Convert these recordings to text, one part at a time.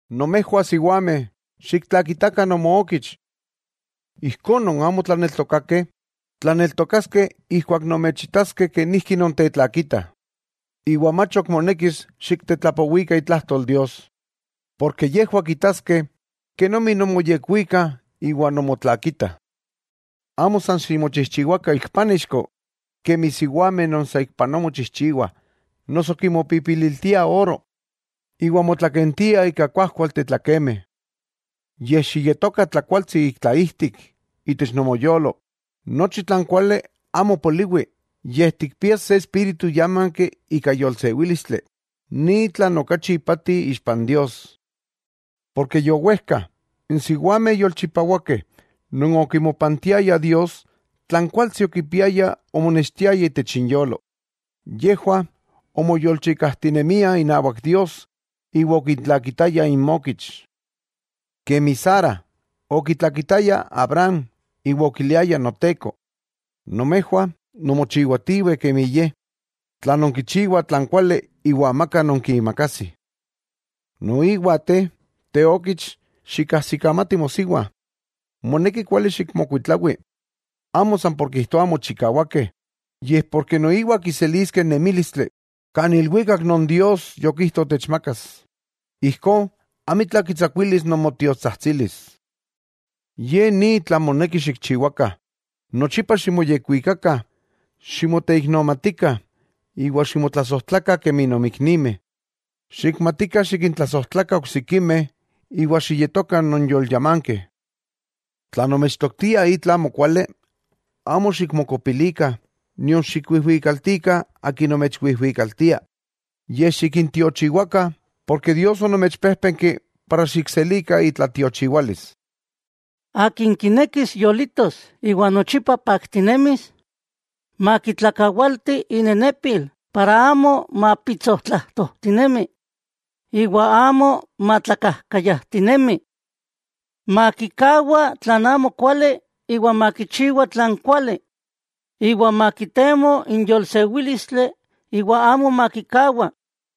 Nomejwah siwameh, xiktlakitakah nomookich. Ijkó, non amo tlaneltokakeh, tlaneltokaskeh ijkuak nomechitaskeh kenijki nontetlakitah, iwa mach ok monekis xiktetlapowikah itlajtol Dios. Porke yejwah kitaskeh kenomi nonmoyekuikah iwa nonmotlakitah. Amo san ximochijchiwakah ik pánixko, kemi n siwameh non saikpanoa mochijchiwah, noso kimopipililtiah oro, iwa motlakentiah ika kuajkualteh tlakemeh. Yej xiyetokah tlakualtsi ik tlaijtik, itech nomoyolo, nochi tlan kuali amo poliwi, yej tikpias se espíritu yámanki ika yolsewílistli, ni tlan okachi ipati ixpa n Dios. Porke yowejka, n siwameh yolchipawakeh non okimopantiayah Dios, tlan kuajkualtsi okipiayah omonextiaya itech inyolo. Yejwah omoyolchikajtinemiah inawak Dios iwa okintlakitayah inmokich. Kemi Sara okitlakitaya Abraham iwa okiliaya “noteko”, nomejwah nonmochiwatiweh kemi ye, tla nonkichiwah tlan kuali iwa amaka nonkiimakajsih. Noiwa te, teokich, xikajsikamati mosiwa, moneki kuali xikmokuitlawi, amo san por kijtoa amo chikawakeh, yej porke noiwah kiseliskeh n nemílistli kan ilwikak non Dios yokijto techmakas. Ijkó amitla kitsakuilis nomotiotsajtsilis. Ye ni tlan moneki xikchiwakah: Nochipa ximoyekwikakah, ximoteiknomatikah iwa ximotlasojtlakah kemi nonmiknimeh. Xikmatikah xikintlasojtlakah oksikimeh iwa xiyetokah nonyolyamankeh. Tla nomechtoktiah itla amokuali, amo xikmokopilikah, nion xikwijwikaltikah akin nomechwijwikaltia, yej xikintiochiwakah, porke Dios onomechpéjpenki para xikselikah itlatiochiwalis. Akin kinekis yolitos iwa nochipa paktinemis, makitlakawalti inenepil para amo mapitsotlajtojtinemi. Iwa amo matlakajkayajtinemi. Makikawa tlan amokuali iwa makichiwa tlan kuali, iwa makitemo n yolsewílistli iwa amo makikawah.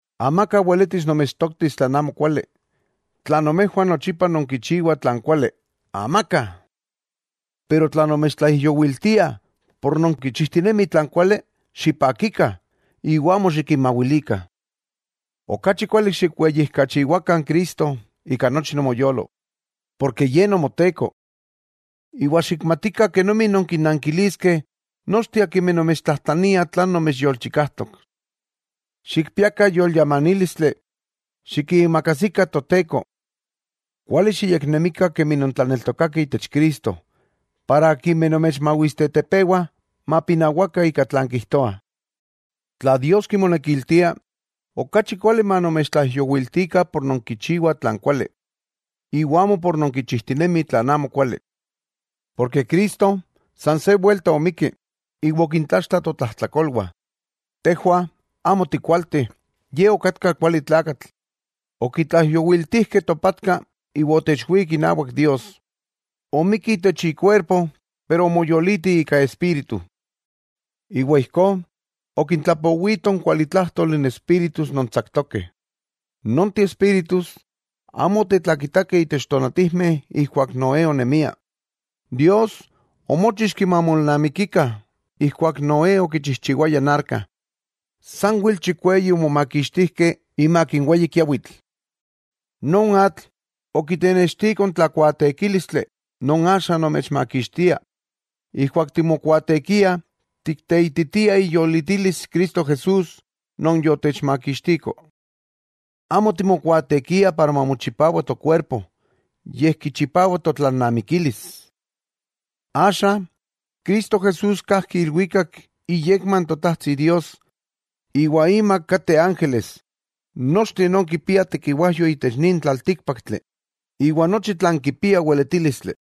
Amaka weletis nomechtoktis tlan amokuali, tla nomejwah nochipa nonkichiwah tlan kuali. ¡Amaka! Pero tla nomechtlaijyowiltiah por nonkichijtinemih tlan kuali, ¡xipakikah! Iwa amo xikinmawilikah. Okachi kuali xikweyijkachiwakah Cristo ika nochi nomoyolo, porke Ye Nomoteko. Iwa xikmatikah kenomi nonkinnankiliskeh nochteh akimeh nomechtlajtlaniah tlan nomechyolchikajtok. Xikpiakah yolyamanílistli, xikiimakajsikah Toteko. Kuali xiyeknemikah kemi non tlaneltokakeh itech Cristo para akimeh nomechmawistetepewa, mapinawakah ika tlan kijtoah. Tla Dios kimonekiltia, okachi kuali manomechtlaijyowiltikah por nonkichiwah tlan kuali, iwa amo por nonkichijtinemih tlan amokuali. Cristo san se welta omikki iwa okintlaxtla totlajtlakolwah. Tejwah amo tikualteh, Ye okatka kuali tlakatl, okitlaijyowiltijkeh topatka iwa otechwík inawak Dios, omikki itech ikuerpo pero omoyoliti ika espíritu. Iwa ijkó okintlapowito n kualitlájtoli n espíritus non tsaktokeh. Nonteh espíritus amo otetlakitakeh itech tonatijmeh ijkuak Noé onemia, Dios omóchixki mamolnamikikah, ijkuak Noé okichijchiwaya n arka. Sanwel chikweyi omomakixtijkeh imak n weyi kiawitl. Non atl, okitenextiko n tlakuaatekílistli non axa nomechmakixtia. Ijkuak timokuaatekiah tikteititiah iyolitilis Cristo Jesús non yotechmakixtiko. Amo timokuaatekiah para mamochipawa tokuerpo, yej kichipawa totlalnamikilis. Axa Cristo Jesús kajki ilwikak iyekma n Totajtsi Dios, iwa imak kateh ángeles, nochteh non kipiah tekiwajyo itech nin tlaltíkpaktli, iwa nochi tlan kipia weletílistli.